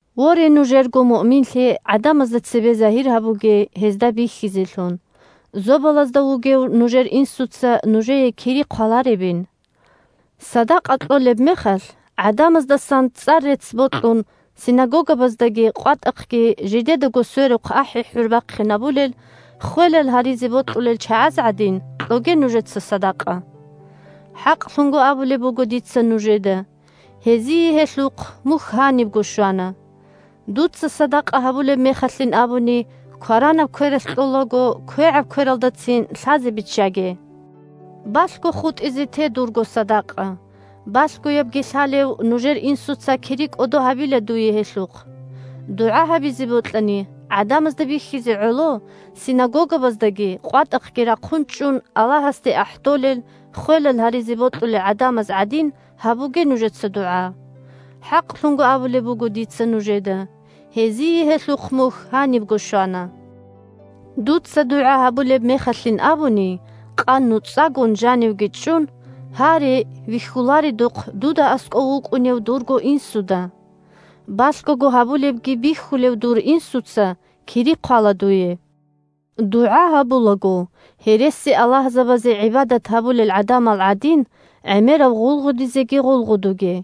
Воре, нужерго муъминлъи гӀадамазда цебе загьир гьабуге, гьезда бихьизелъун, Зобалазда вугев нужер Инсуца нужее кири хъваларебин. Садакъа кьолеб мехалъ, гӀадамаздасан цӀар-рецц бокьун, синагогабаздаги къватӀахъги жидедаго сверухъ ахӀи-хӀур бахъинабулел, ххвелал гьаризе бокьулел чагӀаз гӀадин, кьоге нужеца садакъа. ХӀакълъун абулеб буго дица нужеда: гьезие гьелъухъ мухь гьанибго щвана. Дуца садакъа гьабулеб мехалъин абуни, кваранаб квералъ кьолаго квегӀаб квералдацин лъазе биччаге. Балъго хутӀизе те дурго садакъа, балъгоябги лъалев нужер Инсуца кири кӀодо гьабила дуе гьелъухъ. ДугӀа гьабизе бокьани, гӀадамазда бихьизе гӀоло, синагогабаздаги къватӀахъги рахъун чӀун Аллагьасде ахӀдолел, ххвелал гьаризе бокьулел гӀадамаз гӀадин, гьабуге нужеца дугӀа. ХӀакълъун абулеб буго дица нужеда: гьезие гьелъухъ мухь гьанибго щвана. Дуца дугӀа гьабулеб мехалъин абуни, къан нуцӀагун жанивги чӀун, гьаре вихьуларедухъ дуда аскӀов вукӀунев дурго Инсуда. Балъгого гьабулебги бихьулев дур Инсуца кири хъвала дуе. ДугӀа гьабулаго, гьересиаллагьзабазе гӀибадат гьабулел гӀадамал гӀадин, гӀемерав гъулгъудизеги гъулгъудуге.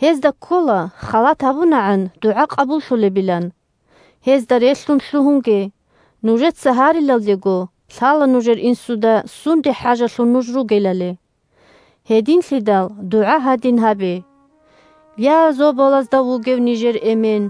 Гьезда ккола халат гьабунагӀан дугӀа къабуллъулебилан. Гьезда релълъун лъугьунге: нужеца гьарилалдего лъала нужер Инсуда сунде хӀажалъун нуж ругелали. Гьединлъидал дугӀа гьадин гьабе: Я, Зобалазда вугев нижер Эмен,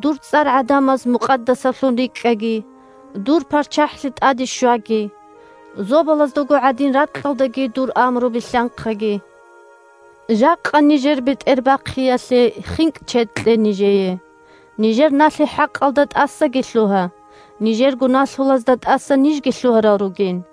дур цӀар гӀадамаз мукъадасаблъун рикӀкӀаги, дур ПарччахӀлъи тӀаде щваги. Зобалаздаго гӀадин ракьалдаги дур амру билълъанхъаги. Жакъа нижер бетӀербахъиялъе хинкӀ-чед кье нижее. Нижер налъи-хӀакъалда тӀасаги лъугьа, нижерго налъулазда тӀаса нижги лъугьарал ругин.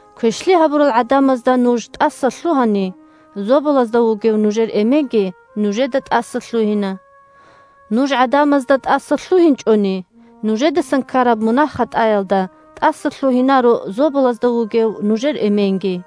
Квешлъи гьабурал гӀадамазда нуж тӀасалъугьани, Зобалазда вугев нужер Эменги нужеда тӀасалъугьина. Нуж гӀадамазда тӀасалъугьинчӀони, нужедасан ккараб мунагь-хатӀаялда тӀасалъугьинаро Зобалазда вугев нужер Эменги.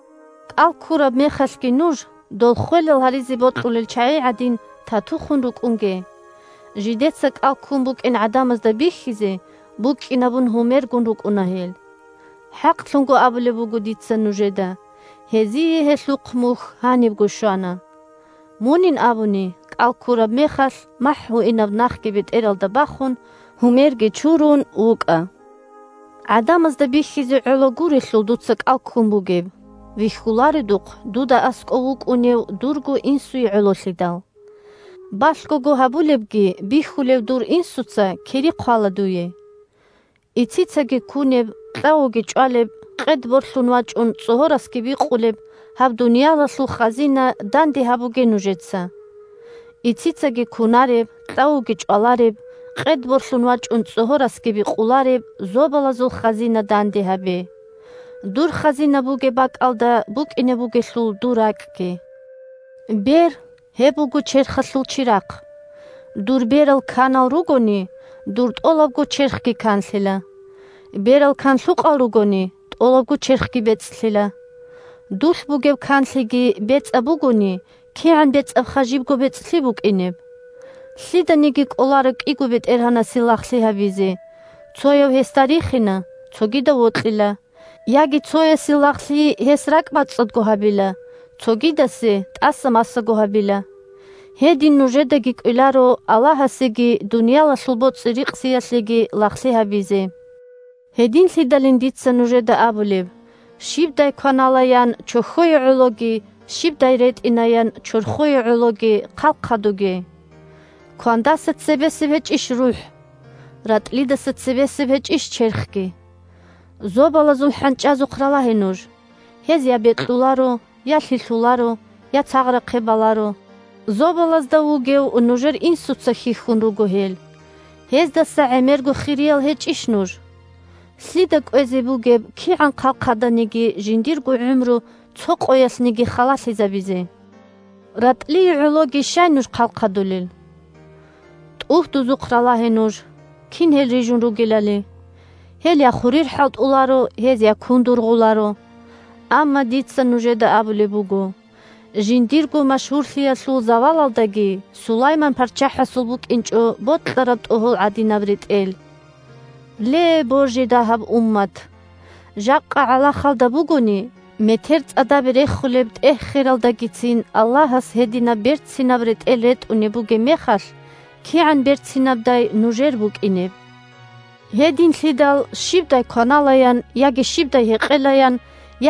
КӀал ккураб мехалъги нуж, дол ххвелал гьаризе бокьулел чагӀи гӀадин, тату хун рукӀунге. Жидеца кӀал ккун букӀин гӀадамазда бихьизе, букӀкӀинабун гьумергун, рукӀуна гьел. ХӀакълъун абулеб буго дица нужеда: гьезие гьелъухъ мухь гьанибго щвана. Мунин абуни, кӀал ккураб мехалъ, махӀ гьуинаб нахги бетӀералда бахун, гьумерги чурун, чӀинкьа-кӀитӀун вукӀа. ГӀадамазда бихьизе гӀоло гурелъул дуца кӀал ккун бугеб, вихьуларедухъ дуда аскӀов вукӀунев дурго Инсуе гӀололъидал. Балъгого гьабулебги бихьулев дур Инсуца кири хъвала дуе. Ицицаги кунеб, кьавуги чӀвалеб, къед борлъун вачӀун цӀогьорасги бикъулеб гьаб дуниялалъул хазина данде гьабуге нужеца. Ицицаги кунареб, кьавуги чӀвалареб, къед борлъун вачӀун цӀогьорасги бикъулареб зобалазул хазина данде гьабе. Дур хазина бугеб бакӀалда букӀине бугелъул дур ракӀги. Бер – гьеб буго черхалъул чирахъ. Дур берал канал ругони, дур тӀолабго черхги канлъила. Берал канлъукъал ругони, тӀолабго черхги бецӀлъила. Дулъ бугеб канлъиги бецӀаб бугони, кигӀан бецӀабха жибго бецӀлъи букӀинеб! Лъиданиги кӀоларо кӀиго бетӀергьанасе лагълъи гьабизе; цояв гьесда рихина, цогидав вокьила; яги цоясе лагълъи гьес ракӀбацӀцӀадго гьабила, цогидасе тӀаса-масаго гьабила. Гьедин нужедаги кӀвеларо Аллагьасеги дуниялалъул боцӀи-рикъзиялъеги лагълъи гьабизе. Гьединлъидалин дица нужеда абулеб: щибдай кваналаян чохьое гӀологи, щибдай ретӀинаян чорхое гӀологи хъалхъадуге. Квандаса цебесеб гьечӀищ рухӀ, ратӀлидаса цебесеб гьечӀищ черхги. Зобалазул хӀанчӀазухъ ралагье нуж: гьез я бекьуларо, я лъилъуларо, я царгъахъе баларо. Зобалазда вугев нужер Инсуца хьихьун руго гьел. Гьездаса гӀемерго хириял гьечӀищ нуж? Лъида кӀвезе бугеб, кигӀан хъалхъаданиги, жиндирго гӀумру цо къоялъниги халалъизабизе? РатӀлие гӀологи щай нуж хъалхъадулел? ТӀугьдузухъ ралагье нуж, кин гьел рижун ругелали. Гьел я хурир хӀалтӀуларо, гьез я кун дургъуларо. Амма дица нужеда абулеб буго: жиндирго машгьурлъиялъул завалалдаги Сулайман парччахӀасул букӀинчӀо бокьараб тӀогьол гӀадинаб ретӀел. Ле, божи дагьаб уммат! Жакъа гӀалахалда бугони, метер цӀадабе рехулеб тӀегь-хералдагицин Аллагьас гьединаб берцинаб ретӀел ретӀунеб бугеб мехалъ, кигӀан берцинабдай нужер букӀинеб! Гьединлъидал щибдай кваналаян, яги щибдай гьекъелаян,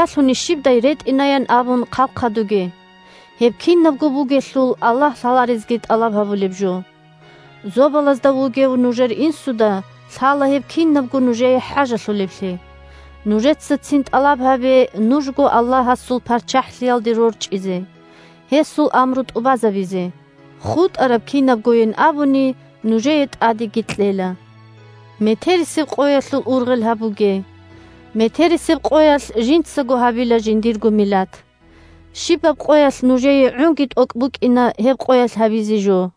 ялъуни щибдай ретӀинаян абун хъалхъадуге. Гьеб кинабго бугелъул Аллагь лъаларезги тӀалаб гьабулеб жо. Зобалазда вугев нужер Инсуда лъала гьеб кинабго нужее хӀажалъулеблъи. Нужеца цин тӀалаб гьабе нужго Аллагьасул ПарччахӀлъиялде рорчӀизе, гьесул амру тӀубазабизе. ХутӀараб кинабгойин абуни нужее тӀадеги кьела. Метерисеб къоялъул ургъел гьабуге. Метерисеб къоялъ жинцаго гьабила жиндирго милат. Щибаб къоялъ нужее гӀунги тӀокӀ букӀина гьеб къоялъ гьабизе жо.